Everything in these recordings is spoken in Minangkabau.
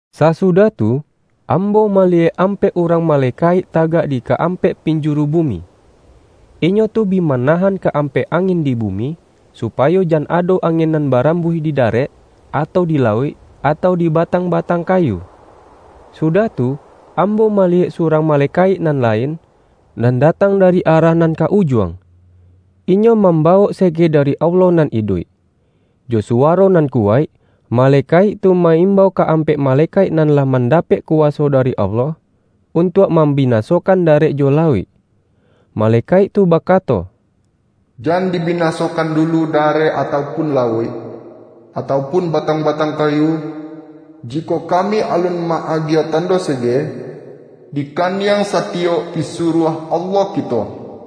Sasudah tu, ambo maliyek ampek urang malekaik tagak di ka-ampek pinjuru bumi. Inyo tu bi mana-han ka-ampek angin di bumi, supayo jan ado angin nan barambuih di da-rek, atau di lauik, atau di batang-ba-tang kayu. Sudah tu, ambo maliyek surang malekaik nan lain, nan datang dari arah nan ka Ujuang. Inyo mam-bawok sege dari Allah nan iduik. Jo suwaro nan kuwaik, malekaik tu ma-imbau ka-ampek malekaik nan lah mandapek kuwaso dari Allah, untuak mambinasokan darek jo lauik. Ma-lekaik tu bakato,”Jan dibinasokan dulu darek atau pun lauik, atau pun batang-batang kayu, jikok kami alun ma-agiah tando sege, di kaniang sati-yok pisuruah Allah kito.”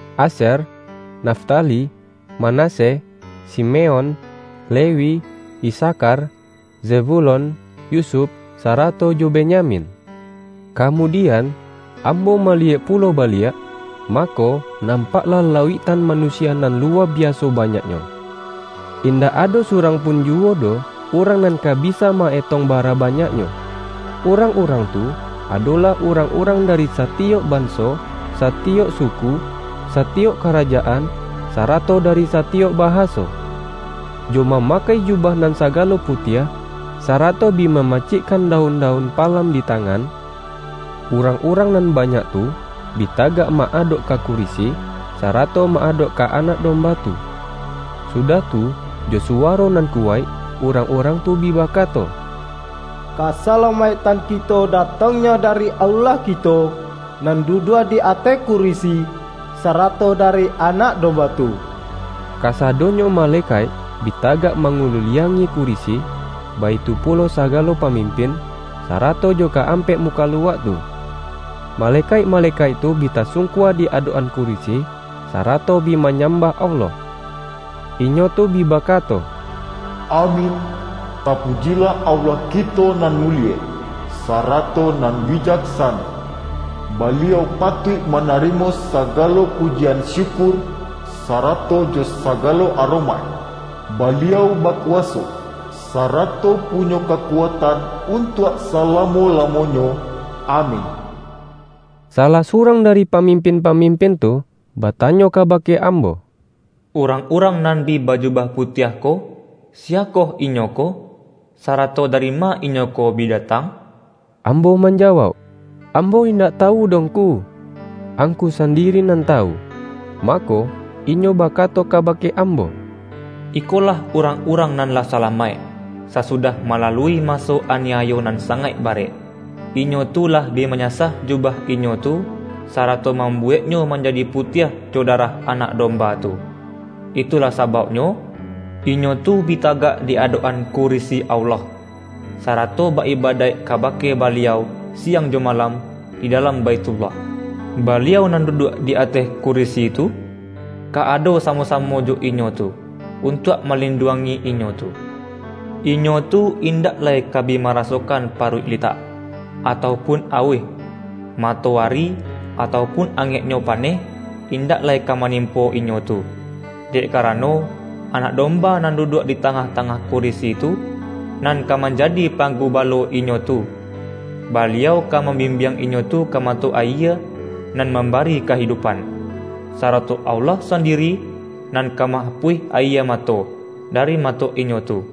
Asyer, Naftali, Manasye, Simeon, Lewi, Isakhar, Zebulon, Yusuf, sarato jo Benyamin. Kamudian, ambo maliyek pulo ba-liak, mako, nampaklah lauiktan manu-sia nan luwa biaso banyaknyo — indak ado surang pun juwo doh urang nan ka bisa ma-etong bara banyaknyo. Urang-urang tu, adolah urang-urang dari sa-tiyok banso, satiyok suku, satiyok ka-rajaan, sarato dari satiyok bahaso. Jo mamakai jubah nan sagalo putiah, sa-rato bi mamacikkan daun-daun palam di tangan, urang-urang nan banyak tu bi tagak ma-adok ka kurisi, sarato ma-adok ka Anak Domba tu. Sudah tu, jo suwaro nan kuwaik urang-urang tu bi bakato,”Kasalamaiktan kito datang-nyo dari Allah kito, nan duduak di ateh kurisi, sarato dari Anak Domba tu!” Kasadonyo malekaik bi tagak ma-nguliliangi kurisi, baitu pulo sagalo pa-mimpin, sarato jo ka-ampek mukaluak tu. Malekaik-malekaik tu bi tasungkua di adok-an kurisi, sarato bi manyam-bah Allah. Inyo tu bi bakato,”Amin! Tapujilah Allah kito nan mulie, sarato nan bijaksano. Baliau patuik manari-mo sagalo pujian syukur, sarato jo sa-galo aromaik. Baliau bakuwaso, sarato punyo kakuatan untuak salamo-lamo-nyo! Amin!” Salah surang dari pamimpin-pa-mimpin tu, batanyo kabake ambo,”Urang-urang nan bi bajubah putiah ko, siyakoh inyo ko, sarato dari ma inyo ko bi datang?” Ambo manjawauk,”Ambo indak ta-wu doh ngku. Angku sandiri nan tawu.” Mako, inyo bakato kabake ambo,”Iko-lah urang-urang nan lah salamaik, sasu-dah malalui maso aniayo nan sangaik barek. Inyo tu lah bi manyasah jubah inyo tu, sarato mambuweknyo manjadi putiah jo darah Anak Domba tu. Itu-lah sabauknyo, inyo tu bi tagak di adok-an kurisi Allah, sarato ba-ibadaik ka-bake Baliau siang jo malam di dalam Baithullah. Baliau nan duduak di ateh kurisi tu, ka ado samo-samo jo inyo tu, untuak malinduangi inyo tu. Inyo tu indak lai ka bi marasokan paruik litak, atau pun auih; matoari, atau pun angek-nyo paneh, indak lai ka manimpo inyo tu, dek karano, Anak Domba nan du-duak di tangah-tangah kurisi tu, nan ka manjadi Panggubalo inyo tu. Baliau ka mambimbiang inyo tu ka mato ayie nan mambari kahidupan. Sarato Allah sandi-ri nan ka ma-apuih ayie mato, dari ma-to inyo tu.”